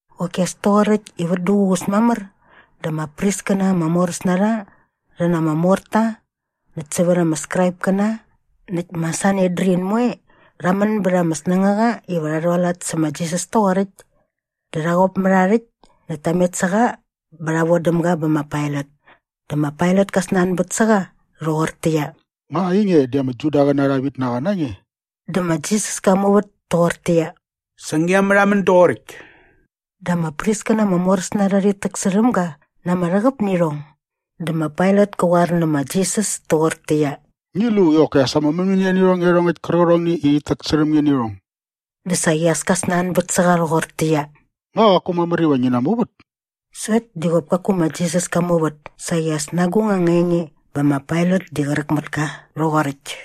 Qoki as toqoräkt i vät duququs mamär dä ama priskäna ama moräs na rha rhi na ama morta näkt sävät ama Skraipkäna näkt ma Sanedrin moe rha män bät ama snängaqa iva rha rhualat sä ma Jisas toqoräkt. Dä rha qop mät aa rhäkt näkt ta met sä qa bä rha vodäm ga bä ma Pailat. Dä ma Pailat kä snanbät sä qa rhoqortäqyia, “Nga ainge di ama Judaqäna arha vitnaqa na nge?” Dä ma Jisas ka muvät toqortäqyia, “Sa ngia märhamän doqoräkt.” Dä ama priskäna ama moräs na rha rhit täksärhäm ga na ama rhäqäp nä irhong. Dä ma Pailat kä qoar nä ma Jisas toqortäqyia, “Ngi lu i qoki as ama mämänia nä irhong iarhongäkt kärqärhongni i rhit täksärhäm nge nä irhong.” Dä saqi as ka snanbät sä qa rhoqortäqyia, “Nga qaku mamär iva ngi namuvät?” Sokt di qop kaku ma Jisas ka muvät saqi as na agung anga enge bä ma Pailat di qräk mät ka rhoqoräkt.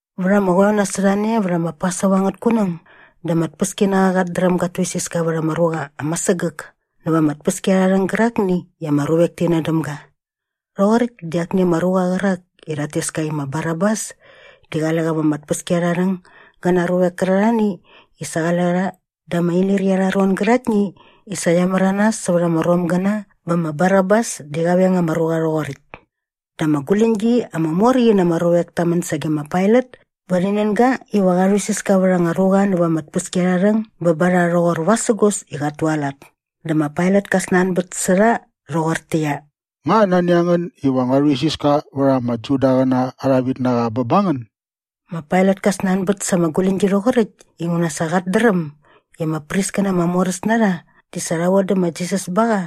Vät ama qoeo nasot a ne vät ma Pasova angät kunäng dä ama tpäskinaqa qat dräm gat tuisiska vät ama ruqa ama sägäk näva ama tpäskiarharhäng gärakni i ama ruvek ti nän däm ga. Rhoqoräkt di akni ama ruqa qärak i rhat tes ka i ma Barabas di qale qa va ama tpäskiarharhäng gä na aa ruavek kärarhani i sa qale rha da ama inirqi arha ron gäraktni i sa qia märanas sävät ama Romgäna bä ma Barabas di sa qa veng ama ruqa rhoqoräkt. Dä ama guläñgi ama mor qi na ama ruvek ta män sage ma Pailat bä rhi nän ga iva qa rhuisiska vät anga ruqa näva ama tpäskiarharhäng bä ba rha rhoqor vasägos i qat tualat. Dä ma Pailat ka snanbät sä rha rhoqortäqyia, “Nga nani a ngän iva ngua rhuisiska vät ama Judaqäna arha vitnaqa bä ba ngän?” Ma Pailat ka snanbät sa ama guläñgi rhoqoräkt inguna sa qat dräm i ama priskäna ama moräs na rha di sa rha vodä ma Jisas ba qa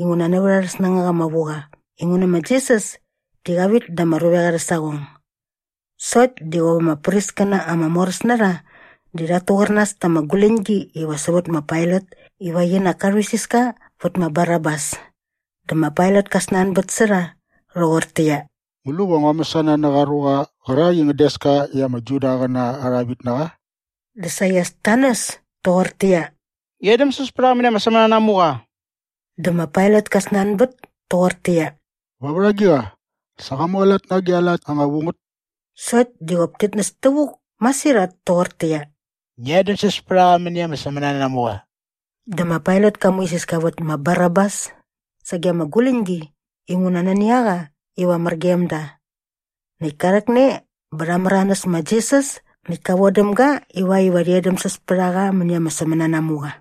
inguna nävät arhä snängaqa ama vu qa inguna ma Jisas di qa vit da ama ruvek arhä saqong. Sokt di qop ama priskäna ama moräs na rha di rhat tuqärnas ta ama guläñgi iva sävät ma Pailat iva qinak ka rhuisiska vät ma Barabas. Dä ma Pailat ka snanbät sä rha rhoqortäqyia, “Ngu lu va ngua mäsana nä qa ruqa qärak i ngän des ka i ama Judaqäna arha vitnaqa?” Dä saqi as ta näs toqortäqyia, “Ngi edämsäs pät a qa mäni ama sämänanamuqa!” Dä ma Pailat ka snanbät toqortäqyia, “Va vät agiqa? Sa qa mualat na agi a lat anga vu ngät?” Sokt di qop tit näs tävuk masirhat toqortäqyia, “Ngi edämsäs pät a qa mäni ama sämänanamuqa!” Dä ma Pailat ka muisiska vät ma Barabas sage ama guläñgi inguna nani a qa iva mär gem da. Näkt ka rhäkne bä rha märanäs ma Jisas näkt ka vodäm ga ivakt iva rhi edämsäs pät a qa mäni ama sämänanamuqa.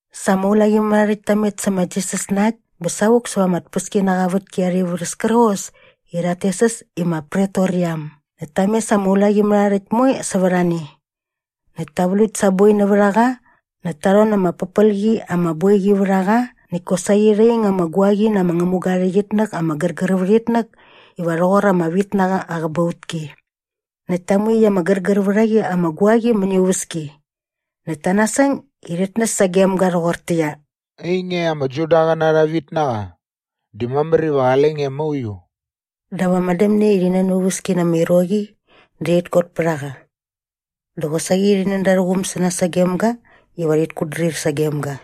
Sa ama ulaqimärharhärhäkt ta met sä ma Jisas na äkt bä savuk säva ama tpäskinaqa aa vätki arha ivärhäs kärqos i rhat tes äs i ma Pretoriam. Näkt ta mes ama ulaqimärharhärhäkt moe sävät a ne. Näkt ta vlukt sa aa boi nävät a qa näkt ta rhon na ama pärpel qi ama boiqi vät a qa näkt kosaqi rha ing ama guaqi na ama ngämuga aa rhäqyitnäk ama gärgär vät itnäk iva rhoqor ama vitnaqa aa qäbautki. Näkt ta mu iaqyäkt ama gärgär vät a qi ama guaqi mäni aa uväski. Näkt ta nasäng i rhit näs sagem ga rhoqortäqyia, “Ainge ama Judaqäna arha vitnaqa, di mamär iva qale nge mauiu.” Dap ama dämne i rhi nän aa uväski na ama iroqi dä rhit kot pät a qa. Dä qosaqi rhi nän da arhä quum sä nas gem ga iva rhit kutdrir sagem ga.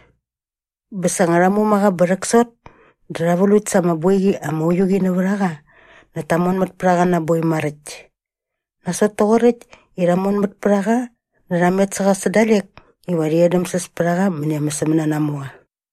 Bä sa nga rha muma qa bä rhäksot dä rha vlukt sa ama boiqi ama uiu qi nävät a qa näkt ta monmät pät a qa na aa boi maräkt. Nasot toqoräkt i rha monmät pät a qa dä rha met sä qa sä dalek iva rhi edämsäs pät a qa mäni ama sämänanamuqa.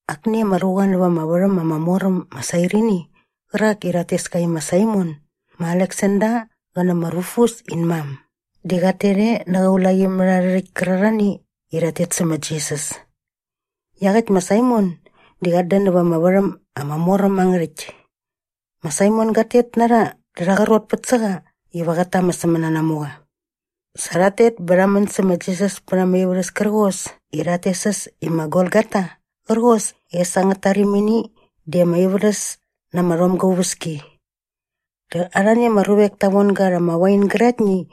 Akni ama ruqa näva ama värhäm ama mor äm ma Sairini qärak i rhat tes ka i ma Saimon ma Aleksander qä nä ma Rufus in mam di qat tet e nä qä ulaqimärharhärhäkt kärarhani i rhat tet sä ma Jisas. Iaqäkt ma Saimon di qat dän nävät ama värhäm ama mor äm angä rhäkt. Ma Saimon gat tet na rha dä rha qrotpät sä qa iva qät ta ama sämänanamuqa. Sa rhat tet bä rha män sä ma Jisas pät ama ivärhäs kärqos i rhat tes äs i ma Golgota qärqos i äs angät tarimini di ama ivärhäs na ama rhomga aa uväski. Dä arhani ama ruvek ta von ga rha ama wain gäraktni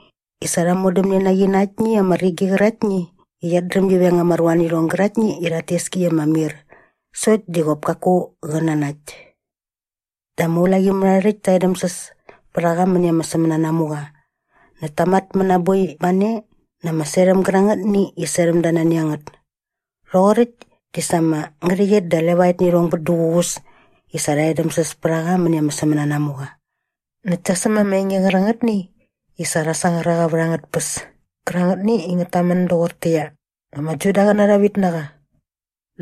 i sa rha modämne na qi na aktni ama rigi qäraktni i qiat dräm gi veng ama ruanirhong gäraktni i rhat tes ki i ama mir sokt di qop kaku qä nanakt. Dä ama ulaqimärharhärhäkt ta edämsäs pät a qa mäni ama sämänanamuqa näkt ta matmät na aa boi ba ne na ama serhäm gärangätni i serhäm da nani a ngät. Rhoqoräkt di sa ama ngärhäqyet da levaet nä irhong bät duququs i sa rha edämsäs pät a qa mäni ama sämänanamuqa. Näkt ta säm ama enge qärangätni i sa rha sangar a qa vät angät tpäs kärangätni i ngät tamän doqortäqyia, “Ama Judaqäna arha vitnaqa.”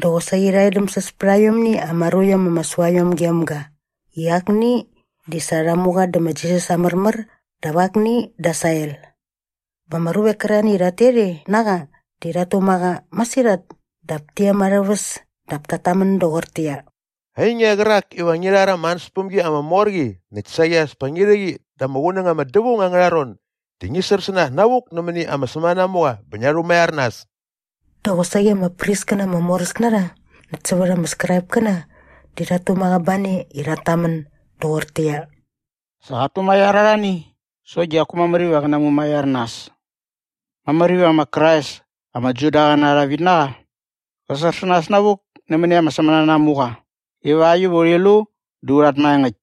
Dä qosaqi rha edämsäs pät aiomni ama ruiom ama sua iom gem ga i akni di sa rha mu qa dä ma Jisas aa märmär dap akni da aa sael. Bä ama ruvek kärarhani i rhat tet e na qa di rhat tuma qa masirhat dap ti em arhä väs dap tat tamän doqortäqyia, “Ainge qärak iva ngi rhar ama ansäspämgi ama mor qi näkt saqi as pa ngi rhä qi da ama qunäng ama dävaung angärha ron di ngi sär sä nas navuk nämäni ama sämänanamuqa bä ngia rhumaiar nas!” Dä qosaqi ama priskäna ama moräs na rha näkt sävät ama Skraipkäna di rhat tuma qa ba ne i rhat tamän doqortäqyia, “Sa qat tumaiar arhani sokt di qaku mamär iva qä namumaiar nas! Mamär iva ma Krais ama Judaqäna arha vitnaqa qä sär sä nas navuk nämäni ama sämänanamuqa ivakt iva urhi lu dä u rhat maengäkt.”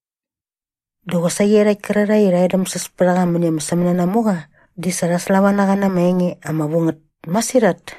Dä qosaqi iarhakt kärarhae i rha edämsäs pät a qa mäni ama sämänanamuqa di sa rha slava na qa na ama enge ama vu ngät masirhat.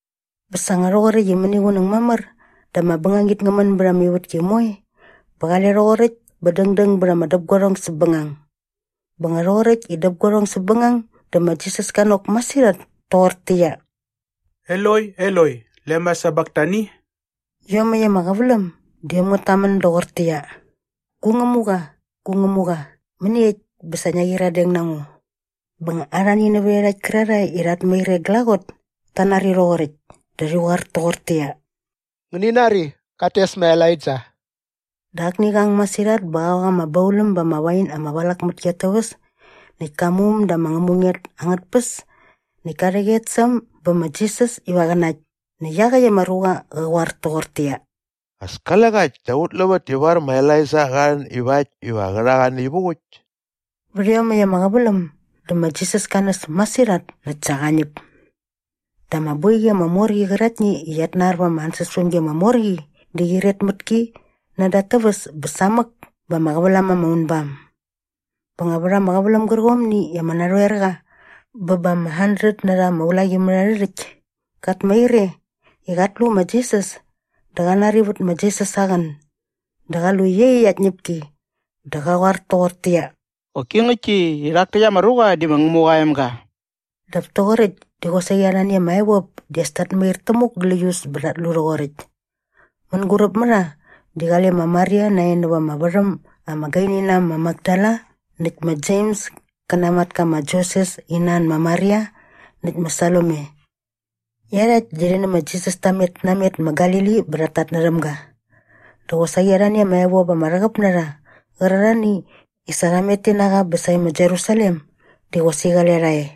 Bä sa nga rhoqoräkt i mäniqunäng mamär dä ama bängangit ngä män bät ama ivätki moe bä qale rhoqoräkt bä dängdäng bät ama däpguarhong säpbängang. Bä nga rhoqoräkt i däpguarhong säpbängang dä ma Jisas ka nok masirhat toqortäqyia, “Eloi, Eloi, lema sabaktani?” Iomäkt ama qäväläm di äm ngät tamän doqortäqyia, “Gu Ngämuqa, gu Ngämuqa, mäniekt bä sa ngia qyiradeng na ngo?” Bä nga arhani nävät iarhakt kärarhae i rhat mair e glaqot ta nari rhoqoräkt dä rhi qoar toqortäqyia, “Ngäni nari, qat tes ma Elaija.” Dä akni qa ang masirhat bä qa ok ama bauläm ba ama wain ama valak mät ki at täväs näkt ka mu äm da ama ngämunget angät tpäs näkt ka rhäqyet sä äm bä ma Jisas iva qä nakt näkt iaqäkt ama ruqa qa qoar toqortäqyia, “As kale qa äkt dap ut luvät ivar ma Elaija qa rhän ivakt iva qä rha qa naivuk äkt.” Vät iomäkt ama qäväläm dä ma Jisas ka näs masirhat näkt sa qa ñäp. Dä ama boiqi ama mor qi qäraktni i qiat nar va ama ansäspämgi ama mor qi di qyiret mät ki nädä at täväs bä samäk bä ama qävälam ama unbam. Bä nga vät ama qäväläm gärqomni i ama narhoerqa bä ba ama handret na rha ama ulaqimärharhärhäkt kat mair e i qat lu ma Jisas dä qa nari vät ma Jisas aa qän dä qa lu iaqyäkt aa tñäpki dä qa qoar toqortäqyia, “Qoki ngäktki i rhak täkt ama ruqa di ma Ngämuqa aa emga!” Dap toqoräkt di qosaqi arhani ama evop di as tat mair tämuk gläius bä rhat lu rhoqoräkt. Mänguräp mä rha di qale ma Maria nae näva ama värhäm ama gaini na äm ma Makdala näkt ma Jems kä na aa matka ma Joses in nan ma Maria näkt ma Salome. Iarhakt di rhi nä ma Jisas ta met namet ma Galili bä rhat tatnärhäm ga. Dä qosaqi arhani ama evop ama rhäqäp na rha qärarhani i sa rha met ti na qa bä sae ma Jerusalem di qosaqi qale rha e.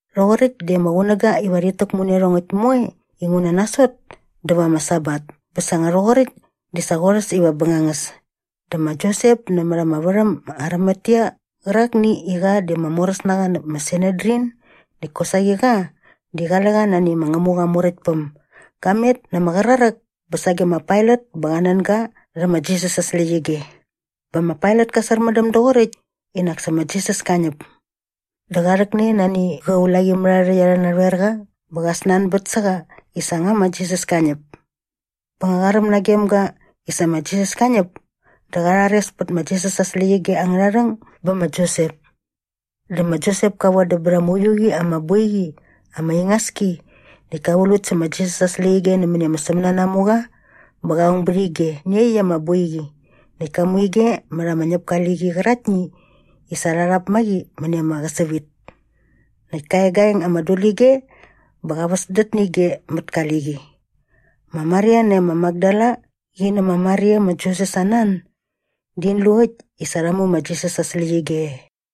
Rhoqoräkt di ama qunäga iva rhit täkmu nä iarhongäkt moe inguna nasot dä va ama Sabat bä sa nga rhoqoräkt di sa qorhäs iva ama bängangäs dä ma Josep nämät ama värhäm ma Arimatea qärakni i qa di ama moräsnaqa näp ma Sanedrin näkt kosaqi qa di qale qa nani ma Ngämuqa aa Muräktpäm ga met na ama qraräk bä sage ma Pailat bä qa nän ga rhä ma Jisas aa släqyige. Bä ma Pailat ka särmändäm doqoräkt i nak sa ma Jisas ka ñäp. Dä qa rhäkne nani qä ulaqimärharhärhäkt arhä narhoerqa bä qa snanbät sä qa i sa nga ma Jisas ka ñäp. Bä nga qa räm nagem ga i sa ma Jisas ka ñäp dä qa rhares pät ma Jisas aa släqyige angärha rhäng bä ma Josep. Dä ma Josep ka vodäm bät ama uiu qi ama boiqi ama ingas ki näkt ka vlukt sä ma Jisas aa släqyige nämäni ama sämänanamuqa bä qa ong bät ige nä iaqyäkt ama boiqi näkt ka mu ige mät ama ñäpka aa liqi qäraktni i sa rha rhap ma qi mäni ama qäsävit. Näkt ka egaeng ama dulige bä qa väsdät nä ige mät ka liqi. Ma Maria nae ma Makdala qi nä ma Maria ma Joses aa nan di in lu äkt i sa rha mu ma Jisas aa släqyige e.